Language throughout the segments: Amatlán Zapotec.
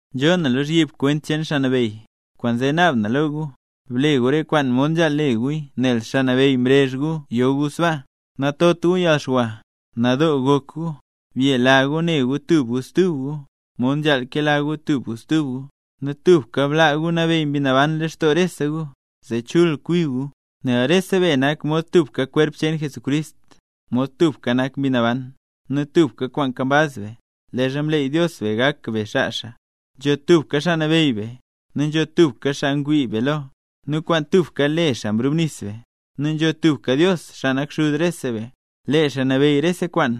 Nzhoo na lozhyib kwent cheen Xaa Nabeyy, kwaanzee naab na lo gu; ble gu re kwaan mod nzhaal le guya nel Xaa Nabeyy mrezh gu yo gu sbaa. Natot gu yalxwa, nadoo gok gu, byela gu ne gu tub gu stub gu, mod nzhaal kela gu tub gu stub gu, nu tubka blaa gu nabeyy Mbi Naban lextoo rese gu, zee chul kwi gu. Nel rese be nak mod tubka kwerp cheen Jesús, mod tubka nak Mbi Naban, nu tubka kwaan nkambaz be, leezha mleey Dios be gak be xaa xaa. Nzho tubka Xaa Nabeyy be, nu nzho tubka xaa ngwii be lo, nu kwaan tubka le xaa mrubnis be; nu nzho tubka Dios, xaa nak Xuz rese be; lee xaa nabeyy rese kwaan,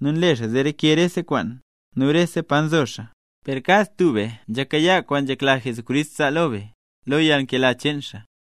nu nle xaa zee reke rese kwaan, nu rese pa nzo xaa. Per kad tub be nzhakayaa kwaan nzhekla Jesucrist zaa lo be, lo yalnkela cheen xaa.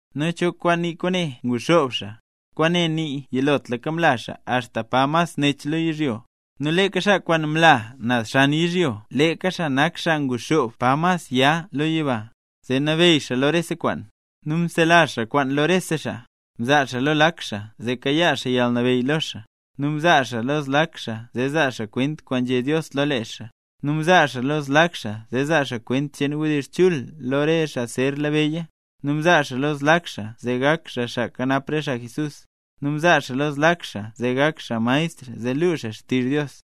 ¿Nu cho kwaan nii kwaane “nguxoob xaa”? Kwaane nii yilotlaka mla xaa axta pa mas nech lo yizhyo. Nu leeka xaa kwaan mla naz xan yizhyo, leeka xaa nak cho nguxoob pa mas ya nzeb lo yiba, zee nabeyy xaa lo rese kwaan. Nu mselazh xaa kwaan lo rese xaa xaa. Mzaa xaa lo lak xaa zee kayaa xaa yalnabeyy lo xaa, nu mzaa xaa lo zlak xaa zee zaa xaa kwent kwaan nzhé Dios lo lee xaa, nu mzaa xaa lo zlak xaa zee zaa xaa kwent cheen wdizh chul lo re xaa zer labeyya, nu mzaa xaa lo zlak xaa zee gak xaa xaa kanap re xaa Jesús, nu mzaa xaa lo zlak xaa zee gak maestr zee luu xaa xtizh Dios.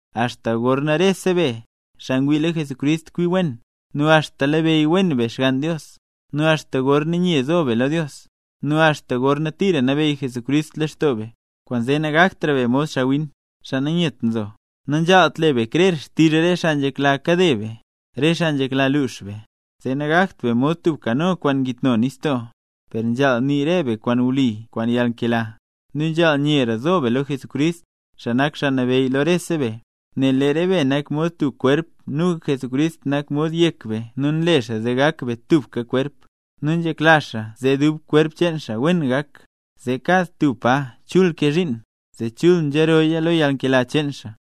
axta gorna rese be, xaa ngwii lo Jesucrist, kwi wen, nu axta labeyy wen be Xgann Dios, nu axta gorna nye zo be lo Dios, nu axta gorna tira nabeyy Jesucrist leen lextoo be. Kwaanzee nagaktra be mod xaawin, xaa nanyet nzo. Nanzhaalt le be krer xtizh re xaa nzhekla kade be, re xaa nzhekla luux be; zee nagakt be mod tub kano kwaan ngitno nistoo. Per nzhaal nii be re kwaan wli kwaan yalnkela, nu nzhaal nyera zo be lo Jesucrist, xaa nak xaa nabeyy lo rese be. Nel lee re be nak mod tub kwerp nu Jesucrist nak mod yek be nu nle xaa zee gak be tubka kwerp. Nu nzhekla xaa zee dub kwerp cheen xaa wen gak, zee kad tub pa chul kee zhiin, zee chul nzhirooya lo yalnkela cheen xaa.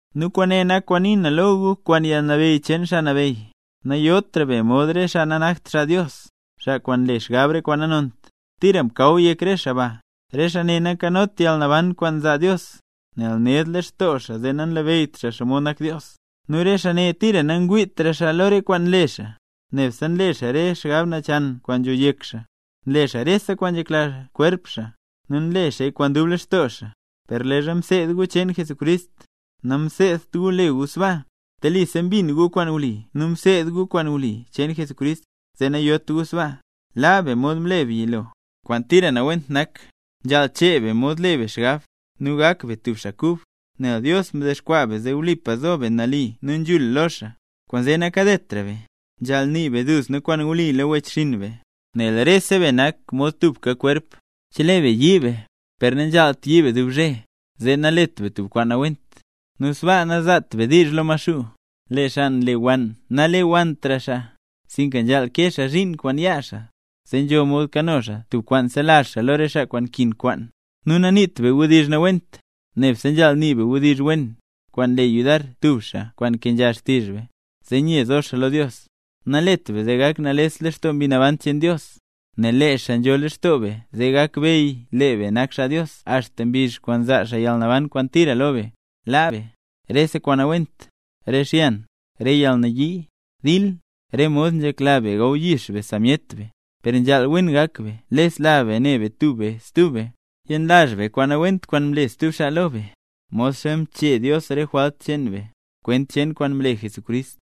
Nu kwaane nak kwaan nii na lo gu kwaan yalnabeyy cheen Xaa Nabeyy: Nayotra be mod re xaa nanakt xaa Dios, xaa kwaan nle xgab re kwaan nanont, tira mkaw yek re xaa ba. Re xaa ne nankanot yalnaban kwaan nzaa Dios, nel ned lextoo xaa zee nanlabeyyt xaa xomod nak Dios. Nu re xaa ne tira nangwiitra xaa lo re kwaan nle xaa, nebse nle xaa re xgab nachan kwaan nzho yek xaa, nle xaa rese kwaan nzhekla kwerp cheen xaa, nu nle xaaya kwaan dub lextoo xaa. Per leezha mseed gu cheen Jesucrist, namseedt gu le gu sbaa. Telisa mbin gu kwaan wli nu mseed gu kwaan wli cheen Jesucrist, zee nayot gu sbaa. Laa be mod mle be yilo, kwaan tira nawent nak. Nzhaal chee be mod le be xgab, nu gak be tub xaa kub, nel Dios mdexkwaa be zee wlipa zo be nali nu nzhul lo xaa. Kwaanzee nakadetra be, nzhaal nii be duzna kwaan wli lo wechxinn be, nel rese be nak mod tubka kwerp. Chelee be yii be, nanzhaalt yii be dub zhe, zee nalet be tub kwaan nawent, nu sbaa nanzaat be diizh lo Maxuu. Lee xaa nlewann nalewanntra xaa, sinka nzhaal kee xaa zhiin kwaan yaa xaa, zee nzho mod kano xaa tub kwaan selazh xaa lo re xaa kwaan nkin kwaan. Nu naniit be wdizh nawent, nebse nzhaal nii be wdizh wen, kwaan nle yudar stub xaa kwaan nkenzha xtizh be, zee nye zo xaa lo Dios. Nalet be zee gak nales lextoo Mbi Naban cheen Dios, nel lee xaa nzho leen lextoo be zee gakbeyy lee be nak xaa Dios axta mbizh kwaan zaa xaa yalnaban kwaan tira lo be. Laa be: re kwaan nawent, re xyan, re yalnayii, dil, re mod nzhekla be gawyix be sa myet be. Per nzhaal: wen gak be lesla be ne be tub be stub be, yenlazh be kwaan nawent kwaan mle stub xaa lo be, modxa mchee Dios re jwalt cheen be, kwent cheen kwaan mle Jesucrist.